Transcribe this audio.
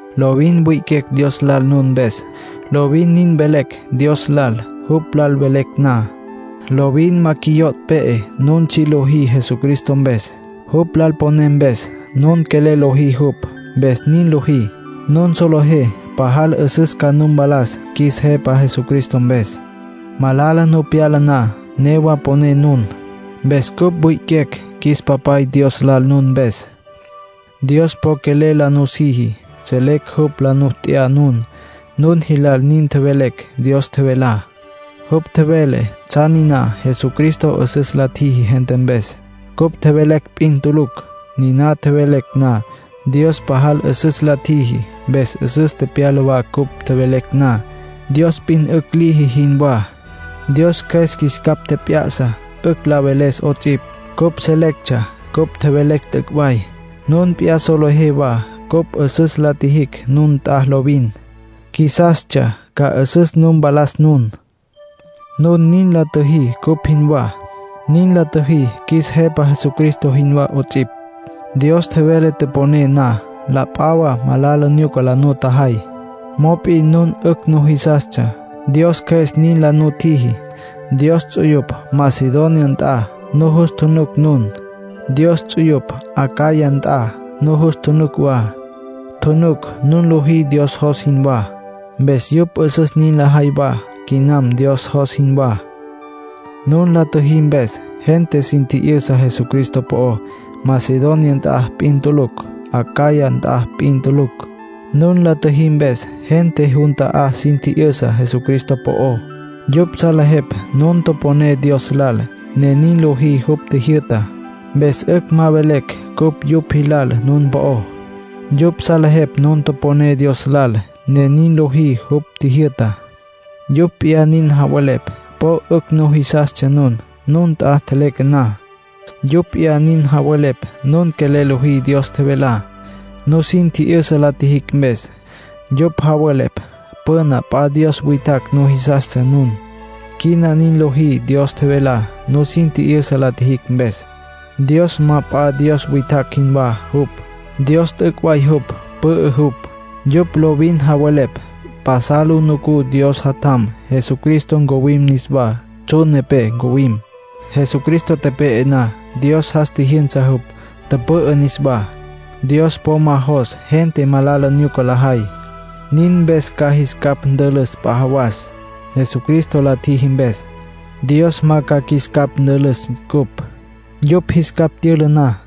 Lovin wi'iquecj Dios lal nun mpes. Lovin nin velecj Dios lal jupj lal velecj na. Lovin ma qjuiyo' pe'e nun tsji' lojí Jesucristo mpes, jupj lal poné mpes. Nun quelel lojí jupj, mpes nin lojí. Nun solejé pajal 'üsüs ca nu mpalas qjuis Jepa Jesucristo mpes. Malala nu pyala na, newa poné nun. Mpes cupj wi'iquecj qjuis Papay Dios lal nun mpes. Dios po quelel la nusiji. Selecj jupj la nu t'ya nun. Nun jilal nin tjevelecj Dios tjevelá. Jupj tjevele tsjan niná Jesucristo 'üsüs la tjiji gente mpes. Cupj tjevelecj p'in tulucj. Niná tjevelecj na, Dios pajal 'üsüs la tjiji, mpes 'üsüs tepyala wa cupj tjevelecj na, Dios p'in 'ücj liji jinwá. Dios Cjües qjuis capj tjep'ya'sa 'ücj la veles 'ots'ipj. Cupj selectsja cupj tjevelecj t'üc' way. Nun p'iyá solejé wa cupj 'üsüs la tjijicj nun nt'a lovin. Qjuisastsja ca 'üsüs nu mpalas nun. Nun nin la tjüjí cupj jinwá. Nin la tjüjí qjuis Jepa Jesucristo jinwá 'ots'ipj. Dios tjevele toponé na, la p'a wa malala nyuca la nutjajay. Mop'in nun 'ücj nujisastsja, Dios Cjües nin la nutjiji. Dios ts'uyupj Macedonia nt'a nujus tjunuc nun. Dios ts'uyupj Acaya nt'a nujus tjunuc wa. Tjunuc nun lojí Dios jos jinwá. Mpes yupj 'üsüs nin lajay wa quinam Dios jos jinwá. Nun la tjüjí mpes, gente sin tji'yüsa Jesucristo po'ó. Macedonia nt'a p'in tulucj, Acaya nt'a p'in tulucj. Nun la tjüjí mpes, gente jun ta'á sin tji'yüsa Jesucristo po'ó. Yupj salejepj nun toponé Dios lal, ne nin lojí jupj tjijyü'tá. Mpes 'ücj ma velecj cupj yupj jilal nun po'ó. Yupj salejepj nun toponé Dios lal, ne nin lojí jupj tjijyü'tá. Yupj p'iyá nin javelepj po 'ücj nujisastsja nun, nun nt'a tjeleque na. Yupj p'iyá nin javelepj nun quelel lojí Dios tjevelá, nusin tji'yüsa la tjijicj mpes. Yupj javelepj püna p'a dios witjacj nujisastsja nun; quina nin lojí Dios tjevelá, nusin tji'yüsa la tjijicj mpes. Dios ma p'a dios witjacj jinwá jupj. Dios t'üc' way jupj, pü'ü jupj. Yupj lovin javelepj pasal lu nucú Dios Jatjam Jesucristo ncuwim niswá, tsjun nepé ncuwim. Jesucristo tepe'e na, Dios jas tjijyünsa jupj, tüpü'ü niswá. Dios po ma jos gente malala nyuca lajay. Nin mpes ca jis capj ntülüs p'a jawas. Jesucristo la tjiji mpes, Dios ma ca qjuis capj ntülüs cupj, yupj jis capj tyüla na.